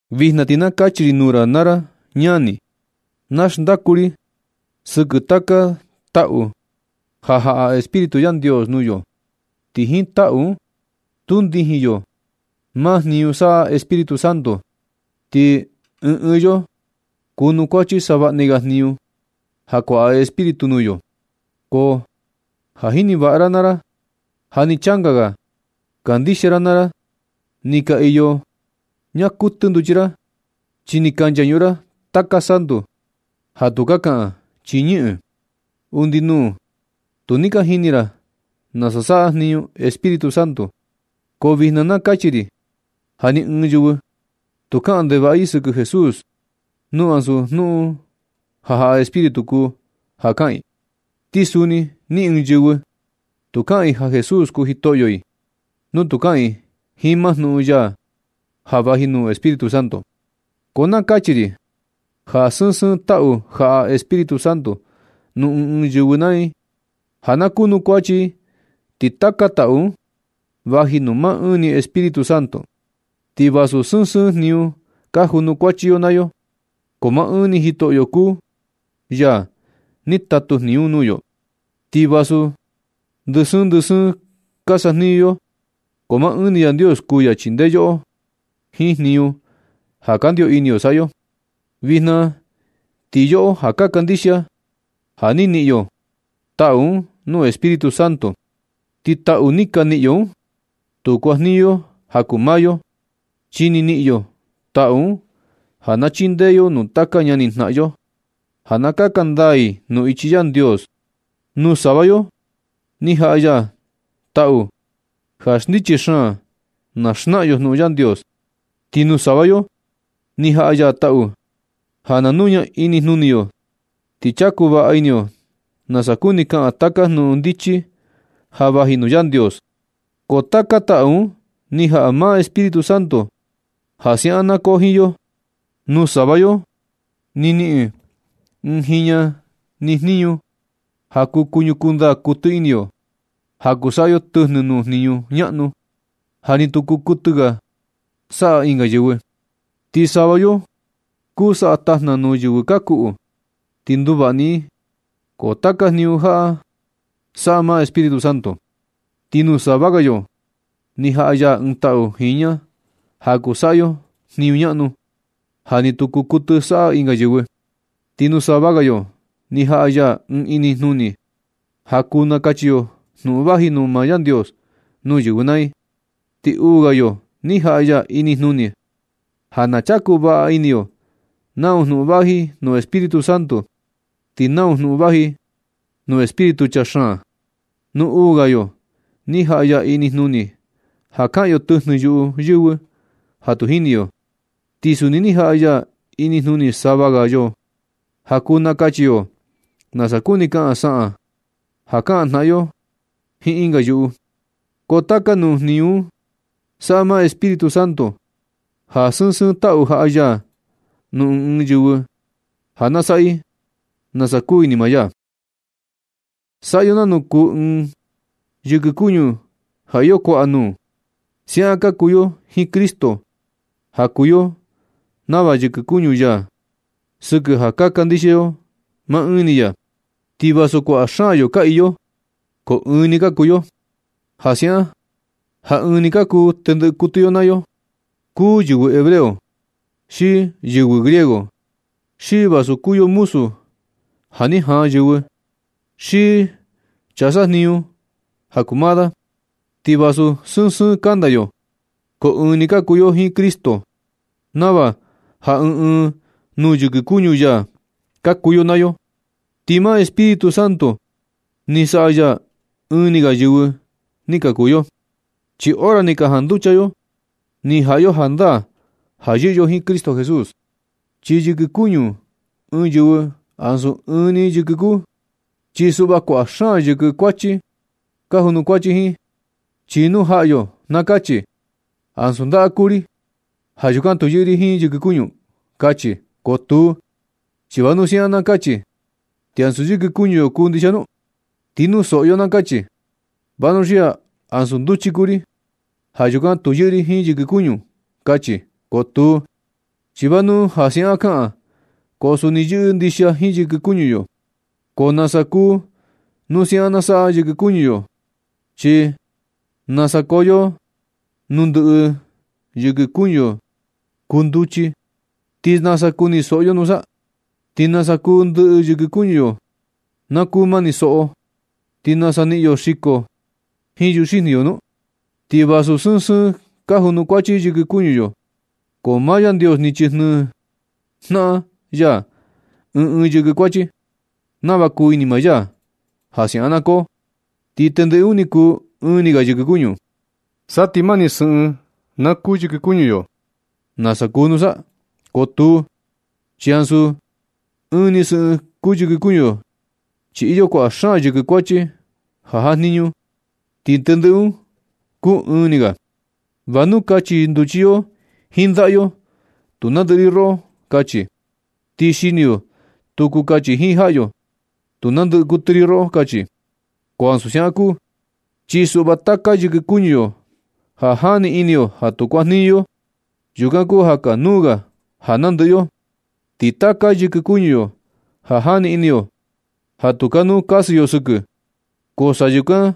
Vijna ti na kachi ri nuu ra naa ra ñani. Na xndaku ri sɨkɨ taka taꞌu ja jaꞌa Espíritu Yandios nuu yo. Ti jiin taꞌu un stuu ndijin yo maa jniñu saꞌa Espíritu Santo. Ti ɨɨn ɨɨn yo kunukuachi savaꞌni ga jniñu ja kuaꞌa Espíritu nuu yo. Ko ja jini vaꞌa ra naa ra ja ni changa ga kandixia ra naa ra ni ka iyo ñaa kuɨtɨ nduchi ra, chi ni ka nchañuꞌun ra taka santu ja tu kuu kaꞌan chi ñɨꞌɨn. Undi nuu tu ni ka jini ra nasa saꞌa jniñu Espíritu Santo, ko vijna na kachi ri ja ni ɨɨn yɨvɨ tu kaꞌan ndevaꞌa i sɨkɨ Jesús, nu ansu jnuꞌun ja jaꞌa Espíritu kuu ja kaꞌan i. Ti suni ni ɨɨn yɨvɨ, tu kaꞌan i ja Jesús kuu jitoꞌyo i nu tu kaꞌan i jiin maa jnuꞌun ja vaji nuu Espíritu Santo. Ko na kachi ri ja sɨɨn sɨɨn taꞌu jaꞌa Espíritu Santo nuu ɨɨn ɨɨn yɨvɨ naa i ja ka kunukuachi i, ti taka taꞌu un vaji nuu maa ɨɨn ni Espíritu Santo. Ti vasu sɨɨn sɨɨn jniñu ka junukuachi yo naa yo, ko maa ɨɨn ni Jitoꞌyo kuu ya ni tatu jniñu un nuu yo. Ti vasu ndɨ sɨɨn ndɨ sɨɨn ka sajniñu yo, ko maa ɨɨn ni Yandios kuu ya chindee yoꞌo jiin jniñu ja kandio ini yo saꞌa yo. Vijna ti yoꞌo ja ka kandixia, ja ni niꞌin yo taꞌu un nuu Espíritu Santo, ti taꞌu ni ka niꞌin yo un, tu kuajniñu yo ja kuu maa yo, chi ni niꞌin yo taꞌu un ja na chindee yo nuu taka ñanijnaꞌan yo ja na kaka ndaa i nuu ichi Yandios. Nuu sava yo ni jaꞌa ya taꞌu ja ndichi xaan na xnaꞌan yo jnuꞌun Yandios. Ti nuu sava yo ni jaꞌa ya taꞌu ja na nuña inijnuni yo ti chaku vaꞌa ini yo nasa kuni kaꞌan taka jnuꞌun ndichi ja vaji nuu Yandios. Ko taka taꞌu un ni jaꞌa maa Espíritu Santo ja siaꞌan na koo jiin yo. Nuu sava yo ni niꞌin ɨɨn jiña ni inijnuni ja kuu kuñukuu ndaa kuɨtɨ ini yo, ja kuu saꞌa yo tɨjnɨ nuu jniñu ñaꞌnu, ja ni tu kuu kuɨtɨ saꞌa ɨnga yɨvɨ. Ti sava yo kuu saꞌa tajna nuu yɨvɨ ka kuꞌu, ti nduvaꞌa ni i. Ko taka jniñu jaꞌa saꞌa maa Espíritu Santo. Ti nuu sava ga yo ni jaꞌa ya ɨɨn taꞌu jiña ja kuu saꞌa yo jniñu ñaꞌnu, ja ni tu kuu kuɨtɨ saꞌa ɨnga yɨvɨ. Ti nuu sava ga yoꞌo ni jaꞌa ya ɨɨn inijnuni ja kuu nakachi yo jnuꞌun vaji nuu maa Yandios nuu yɨvɨ naa i. Ti uu ga yo ni jaꞌa ya inijnuni ja na chaku vaꞌa ini yo nau jnuꞌun vaji nuu Espíritu Santo, ti nau jnuꞌun vaji nuu espíritu chaa xaan. Nuu uu ga yo ni jaꞌa ya inijnuni ja kaꞌan yo tɨjnɨ yuꞌu yɨvɨ ja tu jini yo. Ti suni ni jaꞌa ya inijnuni sava ga yo ja kuu nakachi yo nasa kuni kaꞌan saꞌan ja kaꞌan jnaꞌan yo jiin ɨnga yuꞌu. Ko taka nuu jniñu un saꞌa maa ɨɨn ni Espíritu Santo ja sɨɨn sɨɨn taꞌu ni jaꞌa ya nuu ɨɨn ɨɨn yɨvɨ ja na saꞌa i, nasa kuu ini maa ya. Saꞌa yo nanu kuu ɨɨn yɨkɨ kuñu ja iyo kuaꞌa nuu, siaꞌan ka kuu yo jiin Cristo ja kuu yo nava yɨkɨ kuñu ya sɨkɨ ja ka kandixia yo maa ɨɨn ni ya. Ti vasu kuaꞌa xaan yo ka iyo, ko ɨɨn ni ka kuu yo. Ja siaꞌan ja ɨɨn ni ka kuu tendɨꞌɨ kuɨtɨ yo naa yo, kuu yɨvɨ hebreo, xi yɨvɨ griego, xi vasu kuu yo muzu ja ni jaan yɨvɨ, xi chaa sajniñu ja kuu maa da. Ti vasu sɨɨn sɨɨn kanda yo, ko ɨɨn ni ka kuu yo jiin Cristo, nava ja ɨɨn ɨɨn nuu yɨkɨ kuñu ya ka kuu yo naa yo. Ti maa Espíritu Santo ni saꞌa ya ja ɨɨn ni ga yɨvɨ ni ka kuu yo. Chi hora ni ka janducha yo, ni jaꞌa yo jandaa ja yɨꞌɨ yo jiin Cristo Jesús. Chi yɨkɨ kuñu ɨɨn yɨvɨ ansu ɨɨn ni yɨkɨ kuu, chi suꞌva kuaꞌa xaan yɨkɨ kuachi ka junukuachi jiin. Chi nu jaꞌa yo na kachi: “Ansu ndaꞌa kuu ri. Ja yukan tu yɨꞌɨ ri jiin yɨkɨ kuñu”, kachi. Ko tuu, ¿chi va nu ja siaꞌan na kachi, ti ansu yɨkɨ kuñu yo kuu ndixia nu? Ti nu soꞌo yo na kachi: “Vanuxia ansu nduchi kuu ri. Ja yukan tu yɨꞌɨ ri jiin yɨkɨ kuñu”, kachi. Ko tuu, chi va nu ja siaꞌan kaꞌan, ko suni yɨꞌɨ ndixia jiin yɨkɨ kuñu yo. Ko nasa kuu nu siaꞌan na saꞌa yɨkɨ kuñu yo, ¿chi nasa koo yo nu ndɨꞌɨ yɨkɨ kuñu yo kuu nduchi, ti nasa kuni soꞌo yo nusa? ¿Xi nasa kuu ndɨꞌɨ yɨkɨ kuñu yo na kuu mani soꞌo, ti nasa niꞌin yo xiko jiin yuxijni yo nu? Ti vasu sɨɨn sɨɨn ka junukuachi yɨkɨ kuñu yo, ko maa Yandios ni chijnɨɨ jnaꞌan ya ɨɨn ɨɨn yɨkɨ kuachi, nava kuu ini maa ya ja siaꞌan na koo, ti tendɨꞌɨ un ni kuu ɨɨn ni ga yɨkɨ kuñu. Sa ti mani sɨꞌɨn na kuu yɨkɨ kuñu yo, ¿nasa kuu nusa? Ko tuu, chi ansu ɨɨn ni sɨꞌɨn kuu yɨkɨ kuñu yo, chi iyo kuaꞌa xaan yɨkɨ kuachi ja jajniñu, ti tendɨꞌɨ un kuu ɨɨn ni ga. Va nu kachi nduchi yo jiin ndaꞌa yo: “Tu nandɨꞌɨ ri roꞌo”, kachi. Ni xini yo tu kuu kachi jiin jaꞌa yo: “Tu nandɨꞌɨ kuɨtɨ ri roꞌo”, kachi. Ko ansu siaꞌan kuu, chi suꞌva taka yɨkɨ kuñu yo ja jani ini yo ja tu kuajniñu, ko yukan kuu ja kanuu ga ja nandɨꞌɨ yo. Ti taka yɨkɨ kuñu yo ja jani ini yo ja tu kanuu kasɨ yo sɨkɨ, ko sa yukan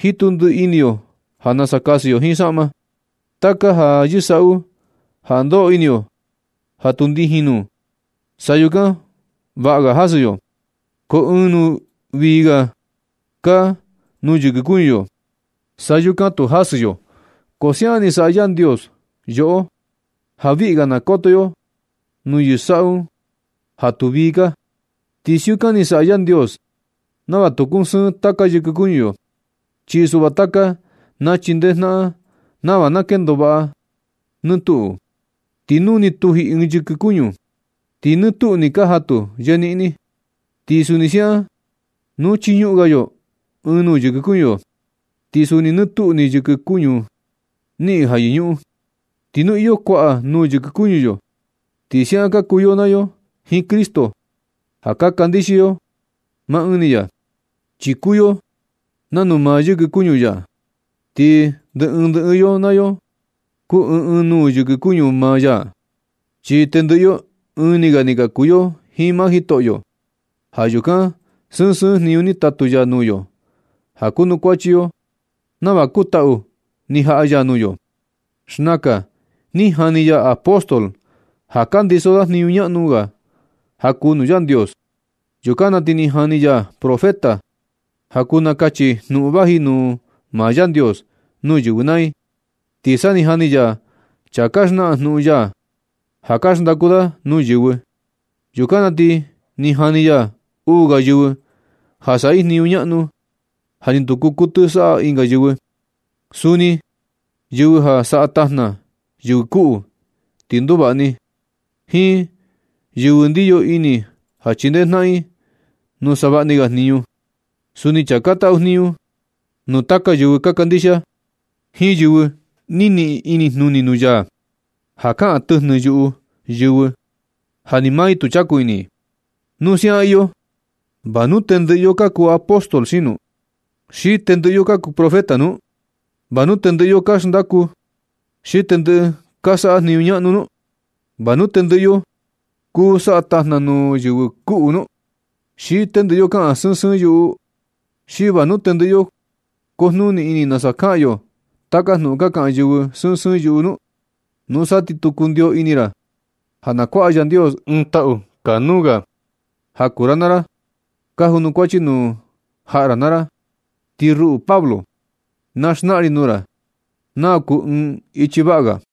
jitu ndiꞌi ini yo ja na kasɨ yo jiin saꞌma, taka ja yɨsaꞌu ja ndoꞌo ini yo ja tu ndijin nuu, sa yukan vaꞌa ga jasɨ yo. Ko ɨɨn nuu vii ga kaa nuu yɨkɨ kuñu yo, sa yukan tu jasɨ yo. Ko siaꞌan ni saꞌa Yandios yoꞌo ja viꞌi ga na koto yo nuu yɨsaꞌu un ja tu vii kaa. Ti siukan ni saꞌa Yandios nava tu kusɨɨn taka yɨkɨ kuñu yo, chi suꞌva taka na chindee jnaꞌan nava na kendo vaꞌa nɨ tuꞌu. Ti nu ni tuji ɨɨn yɨkɨ kuñu, ti nɨ tuꞌu nɨ kaa jatu yeniꞌni. Ti suni siaꞌan nu chiñuꞌun ga yo ɨɨn nuu yɨkɨ kuñu yo, ti suni nɨ tuꞌu ni yɨkɨ kuñu niꞌin ja yɨñuꞌun. Ti nu iyo kuaꞌa nuu yɨkɨ kuñu yo, ti siaꞌan ka kuu yo naa yo jiin Cristo ja ka kandixia yo maa ɨɨn ni ya, chi kuu yo nanu maa yɨkɨ kuñu ya, ti ndɨ ɨɨn ndɨ ɨɨn yo naa yo kuu ɨɨn ɨɨn nuu yɨkɨ kuñu maa ya, chi tendɨꞌɨ yo ɨɨn ni ga ni ka kuu yo jiin maa Jitoꞌyo. Ja yukan sɨɨn sɨɨn jniñu ni tatu ya nuu yo ja kunukuachi yo nava kuu taꞌu ni jaꞌa ya nuu yo. Xnakan ni jani ya apóstol ja ka ndiso da jniñu ñaꞌnu ga ja kuu nuu Yandios. Yukan na ti ni jani ya profeta ja kuu nakachi i jnuꞌun vaji nuu maa Yandios nuu yɨvɨ naa i. Ti sa ni jani ya chaa ka xnaꞌan jnuꞌun ya ja ka xndaku da nuu yɨvɨ. Yukan na ti ni jani ya uu ga yɨvɨ ja saꞌa i jniñu ñaꞌnu, ja ni tu kuu kuɨtɨ saꞌa ɨnga yɨvɨ. Suni yɨvɨ ja saꞌa tajna yɨvɨ kuꞌu ti nduvaꞌa ni i. Jiin yɨvɨ ndiyo ini ja chindee jnaꞌan i nuu savaꞌni ga jniñu. Suni chaa ka taꞌu jniñu nuu yaka yɨvɨ ka kandixia. Jiin yɨvɨ ni niꞌin inijnuni nuu ya ja kaꞌan tɨjnɨ yuꞌu yɨvɨ ja ni maa i tu chaku ini. Nu siaꞌan iyo, ¿va nu tendɨꞌɨ yo ka kuu apóstol nu? ¿Xi tendɨꞌɨ yo kuu profeta nu? ¿Va nu tendɨꞌɨ yo ka xndaku? ¿Xi tendɨꞌɨ ka saꞌa jniñu ñaꞌnu nu? ¿Va nu tendɨꞌɨ yo kuu saꞌa tajna nuu yɨvɨ kuꞌu nu? ¿Xi tendɨꞌɨ yo kaꞌan sɨɨn sɨɨn yuꞌu? ¿Xi va nu tendɨꞌɨ yo kujnuni ini nasa kaꞌan yo taka jnuꞌun ka kaꞌan yɨvɨ sɨɨn sɨɨn yuꞌu nu? Nusa ti kundio ni ini ra ja na kuaꞌa Yandios ɨɨn taꞌu kanuu ga ja kuu ra naa ra, ja kunukuachi nuu jnaꞌan ra naa ra. Ti ruꞌu Pablo, na xnaꞌan ri nuu ra nau kuu ɨɨn ichi vaꞌa ga.